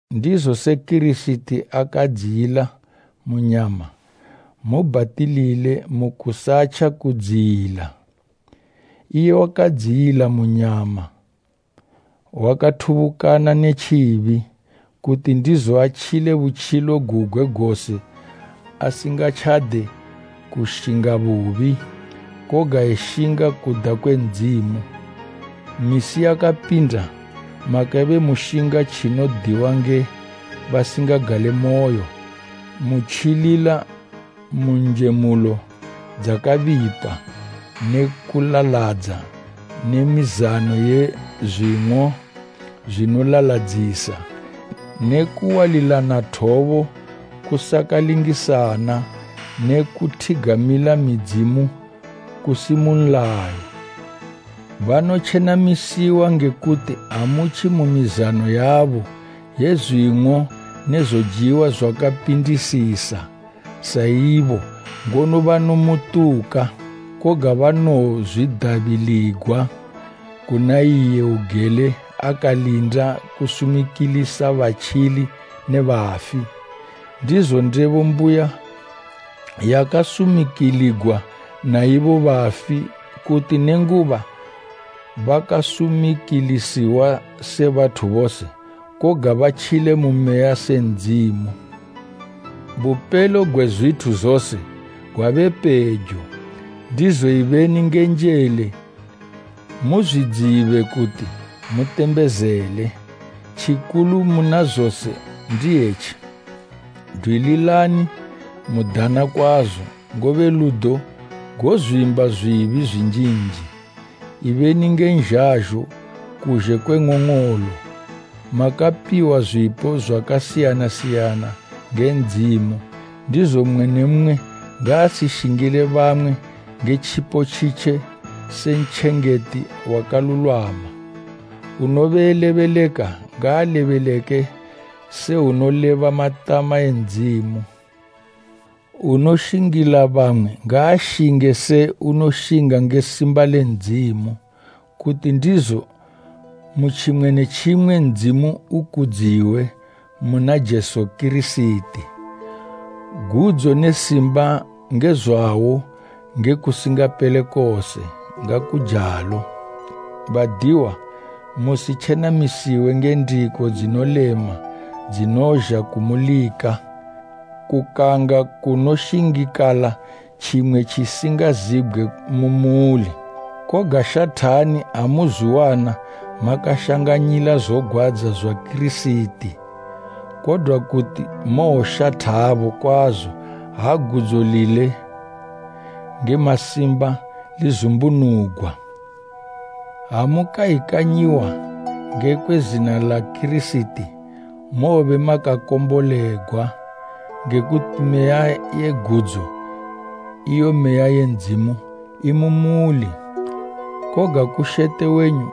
Ndizo se Kirisiti akadziyila mu nyama, mubhatilile mu kusatja kudziyila: iye wakadziyila mu nyama wakathubukana ne tjibi, kuti ndizo atjile butjilo gugwe gose asingatjade kushinga bubi, koga eshinga kuda kwe Ndzimu. Misi yakapinda makabe mushinga tjinodiwa nge basingagalemoyo, mutjilila mu njemulo dzakabipa ne kulaladza ne mizano ye zwing'o zwinolaladzisa ne kuwalilana thobo kusakalingisana ne kuthigamila midzimu kusi mu nlayo. Banotjenamisiwa nge kuti amutji mu mizano yabo ye zwing'o ne zojiwa zwakapindisisa, sa ibo ngono banomutuka. Koga banowozwidabiligwa kuna iye ugele akalinda kusumikilisa batjili ne bafi. Ndizo ndebo mbuya yakasumikiligwa na ibo bafi, kuti nenguba bakasumikilisiwa se bathu bose, koga batjile mu meya se Ndzimu. Bupelo gwe zwithu zose gwabe pejo, ndizo ibeni nge njele muzwidzibe kuti mutembezele. Tjikulu muna zose ndi etji, dwililani mudana kwazo, ngobe ludo gozwimba zwibi zwinjinji. Ibeni nge nzhazho kuzhe kwe ng'ong'olo. Makapiwa zwipo zwakasiyana siyana nge Ndzimu, ndizo mmwe ne mmwe ngaashingile bamwe nge tjipo tjitje se ntjengeti wakalulwama. Unobe elebeleka ngaalebeleke se unoleba matama e Ndzimu. Unoshingila bamwe ngaashinge se unoshinga nge simba le Ndzimu, kuti ndizo mu tjimwe ne tjimwe Ndzimu ukudziwe muna Jesu Kirisiti. Gudzo ne simba nge zwawo nge kusingapele kose. Ngakujalo. Badiwa, musitjenamisiwe nge ndiko dzinolema dzinozha kumulika, kukanga kunoshingikala tjimwe tjisingazibgwe mu muli. Koga shathani ha muzwiwana makashanganyila zogwadza zwa Kirisiti, kodwa kuti mowoshathabo kwazo ha gudzo lile nge masimba lizumbunugwa. Ha mukayikanyiwa ngekwe zina la Kirisiti, mobe makakombolegwa, nge kuti Meya ye gudzo, iyo Meya ye Ndzimu imumuli. Koga kushete wenyu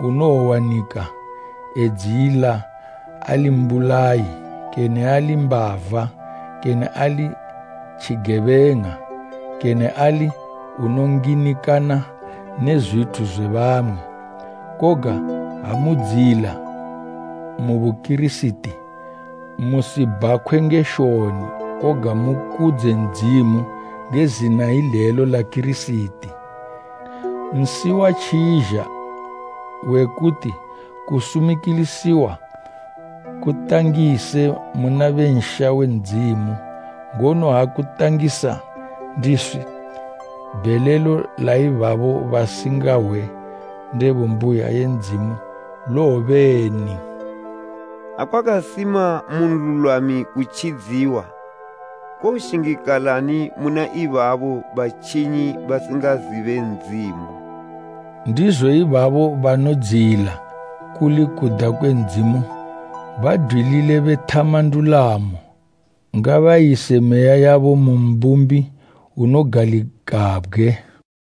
unowowanika edziyila ali mbulayi, kene ali mbava, kene ali tjigebeng'a, kene ali unonginikana ne zwithu zwe bamwe. Koga ha mudziyila mu Bukirisiti, musibhakhwe nge shoni, koga mukudze Ndzimu nge zina ilelo la Kirisiti. Nsi watjizha, we kuti kusumikilisiwa kutangise muna be nsha we Ndzimu, ngono ha kutangisa ndiswi, bhelelo la ibabo basingahwe ndebo mbuya ye Ndzimu lowobeni? “Ha kwakasima mu nlulwami kutjidziwa, kowoshingikalani muna ibaba batjinyi basingazibe Ndzimu?” Ndizo ibabo banodziyila kuli kuda kwe Ndzimu, badwilile bethama ndulamo, ngabayise meya yabo mu Mbumbi unogalikabgwe.